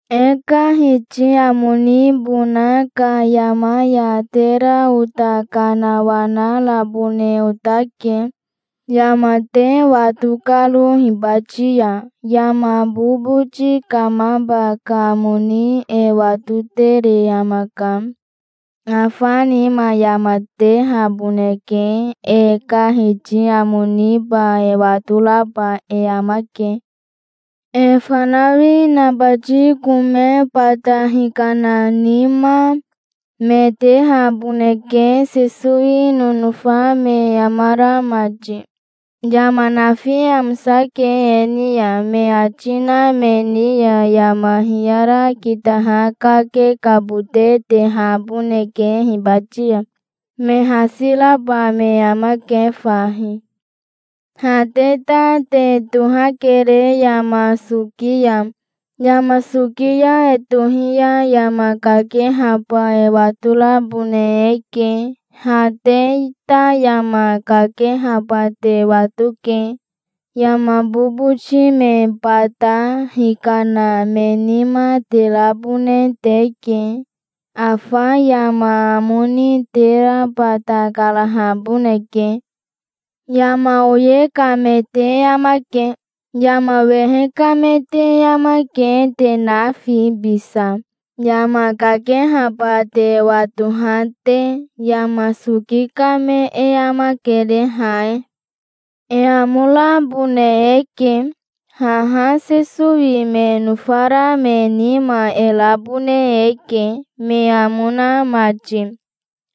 E ka Hiti amo nibona ka yama ya tera ota kanawanarabone otake, yama te wato karo hibati ya. Yama boboti kamaba ka amo ni e watotere amaka. Afa nima yama tehaboneke. E ka Hiti amo niba e watoraba e amake. E fanawi nabati kome bata hikana nima, me tehaboneke, Sesowi nonofa me amara mati. Yama nafi amosake e ni ya, me ati na me ni ya yama hiyara kitaha kakekabote tehaboneke hibati ya. Me hasi raba me amake fahi. Ha te ta te tohakere yama soki ya. Yama soki ya e tohi ya yama kakehaba e watorabone eke. Ha te ta yama kakehaba te watoke. Yama boboti me bata hikana me nima te rabone teke. Afa yama amo ni tera bata karahaboneke. Yama oye ka me te amake. Yama wehe ka me te amake, te nafi bisa, yama kakehaba te watoha te. Yama soki ka me e amakere, ha e. E amo rabone eke! Haha Sesowi me nofara me nima e rabone eke, me amo na mati.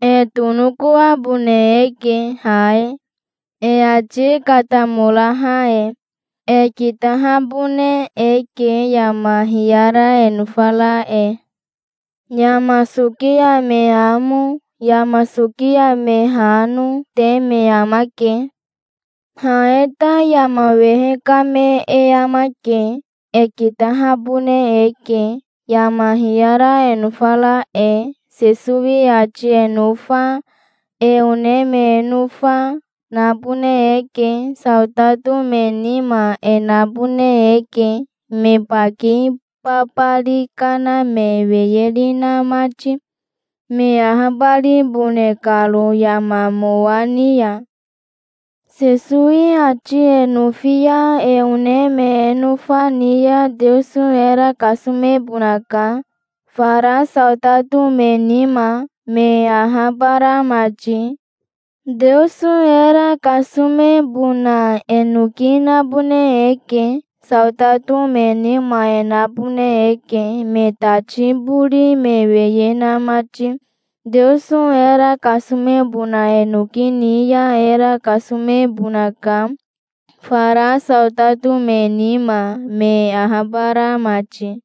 E tonokoabone eke, ha e, e ati katamoraha e. E kitahabone eke, yama hiyara e nofara e. Yama soki ya me amo, yama soki ya me hano, te me amake. Ha e ta yama wehe ka me e amake. E kitahabone eke, yama hiyara e nofara e. Sesowi ati e nofa, e one me e nofa, nabone eke. Saotato me nima e nabone eke, me baki babari kana me weyeri na mati, me ahabaribone karo yama mowa ni ya. Sesowi ati e nofi ya e one me e nofa ni ya Teoso era kasomebonaka, fara saotato me nima, me ahabara mati. Teoso era kasomebona e noki nabone eke. Saotato me nima e nabone eke, me tati bori me weye na mati. Teoso era kasomebona e noki ni ya era kasomebonaka, fara saotato me nima, me ahabara mati.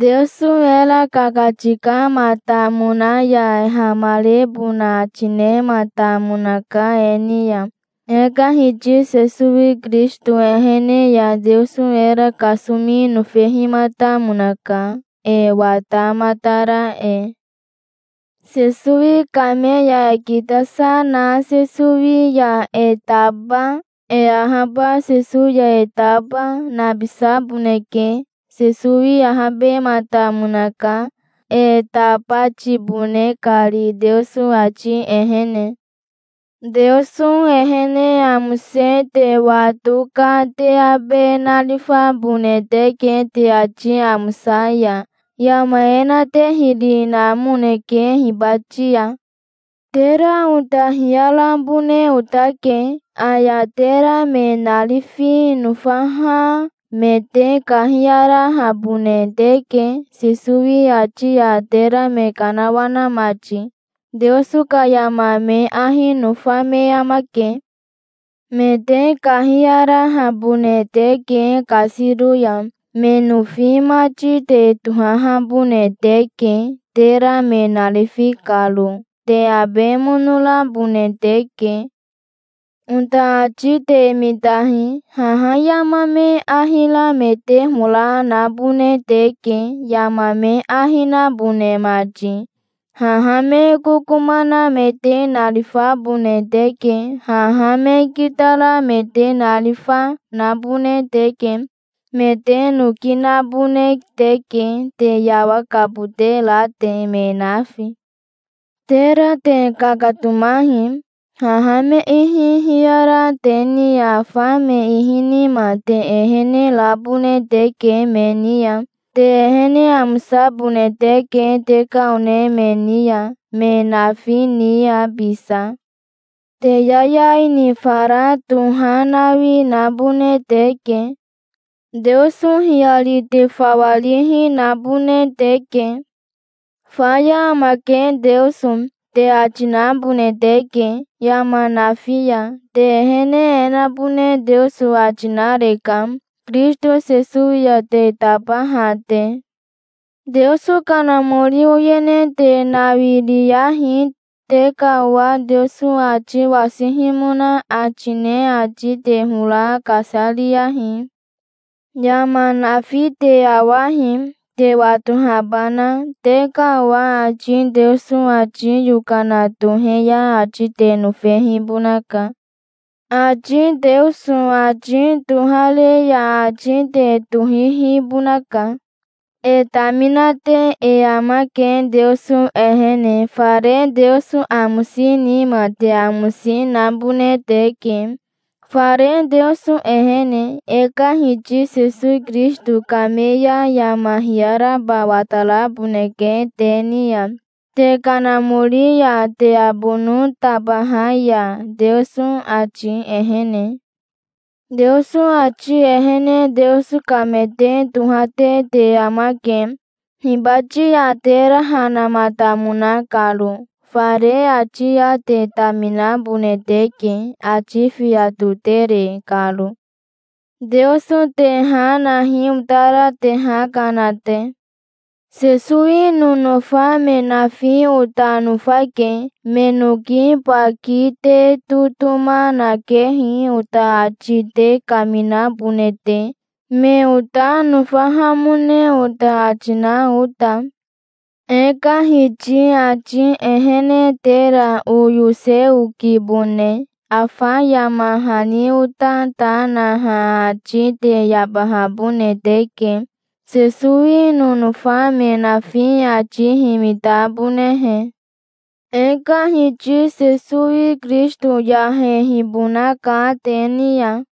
Teoso era kakatikamatamona ya hamarebona ati nematamonaka e ni ya. E ka Hiti Sesowi Kirisito ehene ya Teoso era kasomi nofehimatamonaka, e watamatara e. Sesowi kame ya e kitasa na Sesowi ya e taba, e ahaba Sesowi ya e taba, nabisaboneke. Sesowi ahabematamonaka, e tabatibone kari Teoso ati ehene. Teoso ehene amose te wato ka te abe narifabone teke te ati amosa ya. Yama e na te hiri namoneke hibati ya. Tera ota hiyarabone otake. Aya tera me narifi nofaha, me te kahiyarahabone teke, Sesowi ati ya tera me kanawana mati. Teoso ka yama me ahi nofa me amake. Me te kahiyarahabone teke kasiro ya. Me nofi mati te tohahabone teke, tera me narifi karo. Te abe mono rabone teke. Ota ati te mitahi. Haha yama me ahi ra me te hora nabone teke, yama me ahi nabone mati. Haha me kokoma na me te narifabone teke. Haha me kitara me te narifa, nabone teke. Me te noki nabone teke, te yawakabote ra te, me nafi. Tera te kakatomahi. Haha me ihi hiyara te ni ya afa me ihi nima te ehene rabone teke me ni ya. Te ehene amosabone teke te ka one me ni ya, me nafi ni ya bisa. Te yayai ni fara tohanawi nabone teke. Teoso hiyari te fawa rihi, nabone teke. "Faya amake Teoso", te ati nabone teke, yama nafi ya. Te ehene e nabone Teoso ati nareka, Kirisito Sesowi ya te tabaha te. Teoso Kanamori oyene te nawiriyahi. Te ka owa Teoso ati wasihimona ati ne ati te hora kasariyahi. Yama nafi te awahi, te watohabana. Te ka owa ati Teoso ati yokana tohe ya ati te nofehibonaka. Ati Teoso ati tohare ya ati te tohihibonaka. E taminate e amake Teoso ehene. Fare Teoso amosi nima te amosi nabone teke, fare Teoso ehene. E ka Hiti Sesowi Kirisito kame ya yama hiyaraba wataraboneke te ni ya, te kanamori ya te abono tabaha ya, Teoso ati ehene. Teoso ati ehene Teoso ka me te tohate te amake, hibati ya tera ha namatamona karo. Fare ati ya te taminabone teke, ati fiya totere karo. Teoso te ha nahi otara te ha kana te. Sesowi nonofa me nafi ota nofake. Me noki baki te totoma nakehi, ota ati te kaminabone te, me ota nofahamone ota ati na ota. E ka Hiti ati ehene tera oyose okibone. Afa yama hani ota ta naha ati te yabahabone teke, Sesowi nonofa me nafi ati himitabonehe. E ka Hiti Sesowi Kirisito yahehibonaka te ni ya.